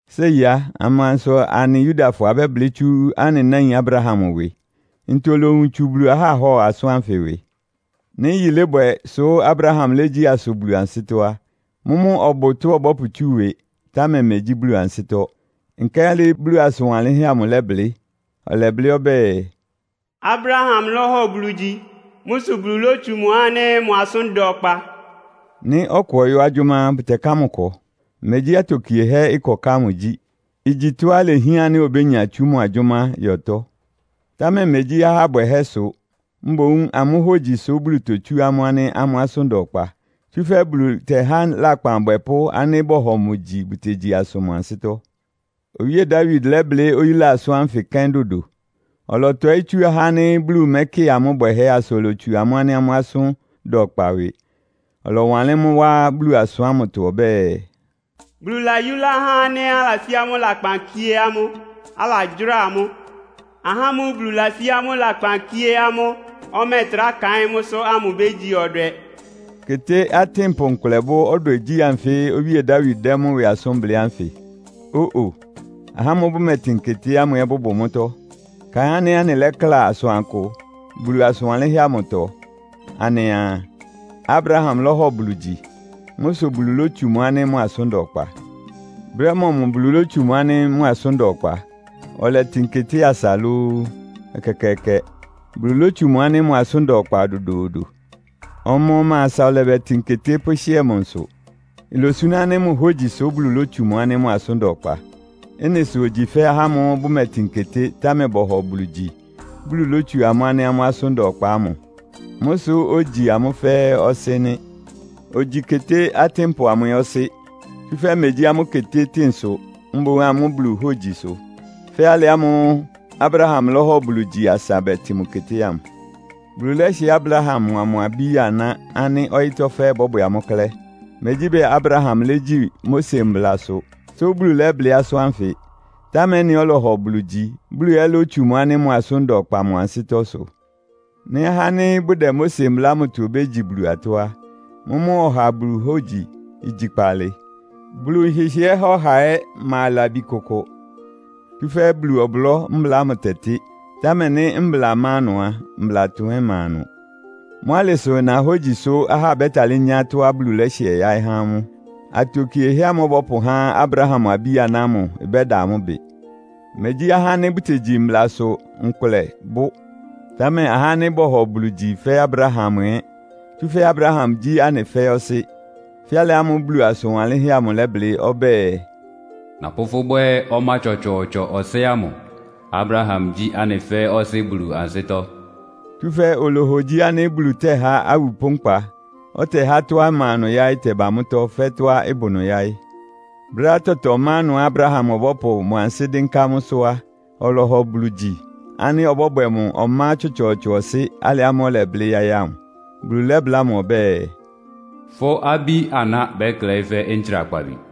Séi á, amansʋ anɩ Yudafɔ abɛ́blɩ́ tsú anɩ náin Abraham ɩwɩ? Ntɔ olowun tsu Bulu aháhɔ asʋ́n ánfɩ ɩwɩ? Nɩ́ yilébwɛ sʋ́ Abraham légyí asʋ Bulu ansɩ́tɔ́ á, mʋ́mʋ́ ɔbʋ tɔ́á ɔbɔ́pʋtsú ɩwɩ, támɛ megyí Bulu ansɩ́tɔ́. Nkálɩ Bulu asʋn wanlɩ́nhɛ́ amʋ lɛ́blɩ́? Ɔlɛblɩ́ ɔbɛ́ɛ, “Abraham lɔ́hɔ Bulu gyi. Mʋ́ sʋ Bulu lótsu mʋ ánɩ́ mʋ asʋ́n da ɔkpa.” Nɩ́ ɔkʋ ɔyɔ́ agyʋ́má á, bʋtɛká mʋ ɩkɔ. Megyí atokiehɛ́ ɩkɔká ámʋ gyí. Igyi tɔ́á ilehián ánɩ́ obénya tsú mʋ agyʋ́má yɔtɔ́. Támɛ megyí ahá bwɛhɛ́ sʋ, mboún amʋ́ hógyi sʋ́ Bulu totsú amʋ́ ánɩ́ amʋ́ asʋ́n da ɔkpa. Tsúfɛ́ Bulu tɛ́há lakpan abwɛpʋ́ ánɩ́ bɔhɔ mʋ gyi bʋtegyi asʋ mʋ ansɩ́tɔ́. Owíe Dawid lɛ́blɩ́ oyúla asʋ́n ánfɩ kɛ́n dodo. Ɔlɔtɔɩ́ tsú ahá ánɩ́ Bulu mɛ́kɩ amʋ́ bwɛhɛ́ asa olotsu amʋ́ ánɩ́ amʋ́ asʋ́n da ɔkpa ɩwɩ. Ɔlɔwanlɩ́n mʋ́ wá Bulu asʋn ámʋtɔ ɔbɛ́ɛ, “Bulu layúlá ahá ánɩ́ alasí amʋ́ lakpan kíé amʋ́, alagyʋ́ra amʋ́! Ahá ámʋ́ʋ́ Bulu lasí amʋ́ lakpan kíé amʋ́, ɔmɛ́ɛtrá kaɩ́n mʋ́sʋ́ ámʋ bégyi ɔdwɛ!” Keté atɩ́npʋ nkʋlɛ bʋ́ ɔdwɛgyí anfɩ́ Owíe Dawid dɛ́ mʋ́ ɩwɩ asʋ́n blɩ́ ánfɩ? Ó-o! Ahá ámʋ́ʋ́ bʋmɛtɩn keté ámʋ ɛ́ bʋbʋ mʋ́tɔ́. Kaɩn ánɩ́ anɩlakla asʋankʋ Bulu asʋn wanlɩ́nhɛ́ amʋtɔ. Anɩa, “Abraham lɔ́hɔ Bulu gyi. Mʋ́ sʋ Bulu lótsu mʋ ánɩ́ mʋ asʋ́n da ɔkpa.” Brɛ́ mɔmʋ Bulu lótsu mʋ ánɩ́ mʋ asʋ́n da ɔkpa? Ɔlɛtɩn keté asa lóó? Ɛkɛkɛɛkɛ! Bulu lótsu mʋ ánɩ́ mʋ asʋ́n da ɔkpa dodoodo. Ɔma-ɔma asa ɔlɛbɛtɩn keté pʋ́hɩ́ɛ mʋ nsʋ. Ilosuná ánɩ́ mʋ hógyi sʋ́ Bulu lótsu mʋ ánɩ́ mʋ asʋ́n da ɔkpa. Ɩ́nɩ sʋ ogyi fɛ́ ahá ámʋ́ʋ́ bʋmɛtɩn keté, támɛ bɔhɔ Bulu gyi, Bulu lótsu amʋ́ ánɩ́ amʋ́ asʋ́n da ɔkpa ámʋ. Mʋ́ sʋ ogyi amʋ́ fɛ́ɛ́ ɔsɩ́ nɩ́. Ogyi keté atɩ́npʋ amʋ ɛ́ ɔsɩ́. Tsúfɛ́ megyí amʋ́ ketétɩ́ɩn sʋ, mboún amʋ́ Buluhógyi sʋ. Fɛ́ alɩ ámʋ́ʋ́ Abraham lɔ́hɔ Bulu gyi asa bɛtɩn mʋ keté ámʋ. Bulu lɛ́hɩɛ Abraham mʋa mʋ abí-aná ánɩ́ ɔyɩ́tɔ́ fɛ́ɛ́ ɩbɔ́bwɛ amʋ́ klɛ́. Megyí bɛɛ Abraham légyi Mose mblasʋ, sʋ Bulu lɛ́blɩ́ asʋ́n ánfɩ. Támɛ ɩ́nɩá ɔlɔhɔ Bulu gyi, Bulu ɛ́ lótsu mʋ ánɩ́ mʋ asʋ́n da ɔkpa mʋ ansɩ́tɔ́ sʋ. Nɩ́ ahá ánɩ́ bʋdɛ Mose Mbla ámʋtɔ obégyi Bulu atɔ́ á, mʋ́mʋ́ ɔha Bulu hógyi igyi kpaalɩ. Bulu nhɩhɩɛ́ há ɔha ɛ́ ma labi kʋkʋ. Tsúfɛ́ Bulu ɔblɔ́ mbla ámʋ tɛtɩ́. Támɛ nɩ́ mbla má ɩnʋ á, mblatʋn ɛ́ ɩma ɩnʋ. Mʋ́ alɩ sʋ ɩna hógyisʋ ahá bɛ́talɩ́ nyá atɔ́á Bulu lɛ́hɩɛ yáɩ́ há amʋ́. Atokiehɛ́ ámʋ́ʋ́ ɔbɔ́pʋhá Abraham abí-aná ámʋ ɩbɛ́da amʋ́ ɩbɩ. Megyí ahá ánɩ́ bʋtegyi mblasʋ nkʋlɛ bʋ́, támɛ ahá ánɩ́ bɔhɔ Bulu gyi fɛ́ Abraham ɛ́. Tsúfɛ́ Abraham gyí anɩ fɛ́ɛ́ ɔsɩ́. Fɛ́ alɩ ámʋ́ʋ́ Bulu asʋn wanlɩ́nhɛ́ amʋ ɩlɛblɩ́ ɔbɛ́ɛ, “Napʋ́ fʋ́ bwɛ́ ɔmá tsɔtsɔɔtsɔ ɔsɩ́ ámʋ. Abraham gyí anɩ fɛ́ɛ́ ɔsɩ́ Bulu ansɩ́tɔ́.” Tsúfɛ́ olohogyi ánɩ́ Bulu tɛ́há awupʋ́ nkpa, ɔtɛhá tɔ́á ɩma ɩnʋ yáɩ́ ɩtɛba mʋ́tɔ́ fɛ́ tɔ́á ɩbʋ ɩnʋ yáɩ́. Brɛ́á tɔtɔ má ɩnʋá Abraham ɔbɔ́pʋ mʋ ansɩ́ dɩ́nká mʋ́sʋ́ á, ɔlɔhɔ Bulu gyi ánɩ́ ɔbɔ́bwɛ mʋ ɔmá tsɔtsɔɔtsɔ ɔsɩ́ alɩ ámʋ́ʋ́ ɔlɛblɩ́ yáɩ́ ámʋ. Bulu lɛ́bláa mʋ ɔbɛ́ɛ, “Fʋ́ abí-aná bɛ́klɛɩ́ fɛ́ ntsrakpabi.”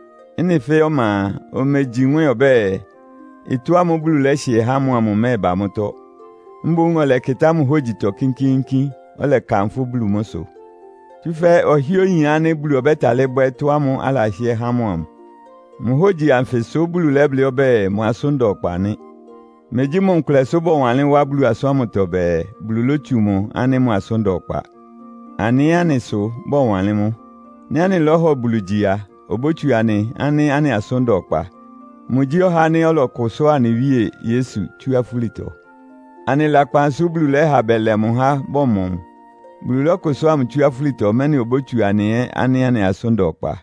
Ɩ́nɩ fɛ́ɛ́ ɔma a, omegyi nwɛ́ɛn ɔbɛ́ɛ, ɩtɔ́ ámʋ́ʋ́ Bulu lɛ́hɩɛ mʋ amʋ ɩmɛ́ɛba mʋ́tɔ́. Mboún ɔlɛkɩtá mʋ hógyitɔ kínkíínkín, ɔlɛkanfʋ́ Bulu mʋ́ sʋ. Tsúfɛ́ ɔhɩ́ɛ́ oyin ánɩ́ Bulu ɔbɛ́talɩ́ bwɛ́ ɩtɔ́ ámʋ́ʋ́ alahɩ́ɛ́ há mʋ amʋ. Mʋ hógyi anfɩ sʋ́ Bulu lɛ́blɩ́ ɔbɛ́ɛ, mʋ asʋ́n da ɔkpa nɩ́. Megyí mʋ nkʋlɛ sʋ bɔwanlɩ́n wá Bulu asʋ́n ámʋtɔ bɛɛ, “Bulu lótsu mʋ ánɩ́ mʋ asʋ́n da ɔkpa.” Anɩ ɛ́, anɩ sʋ bɔwanlɩ́n mʋ́. Nɩ́ anɩlɔ́hɔ Bulu gyi a, obótsu anɩ ánɩ́ anɩ asʋ́n da ɔkpa. Mʋgyí ɔhá ánɩ́ ɔlɔkʋsʋ́a anɩ Wíe Yesu tsú afúlitɔ. Anɩ lakpan sʋ́ Bulu lɛ́ha bɛlɛ mʋ há bɔmɔ mʋ. Bulu lɔ́kʋsʋ́a mʋ tsú afúlitɔ, mɛ́nɩ obótsu anɩ ɛ́ ánɩ́ anɩ asʋ́n da ɔkpa.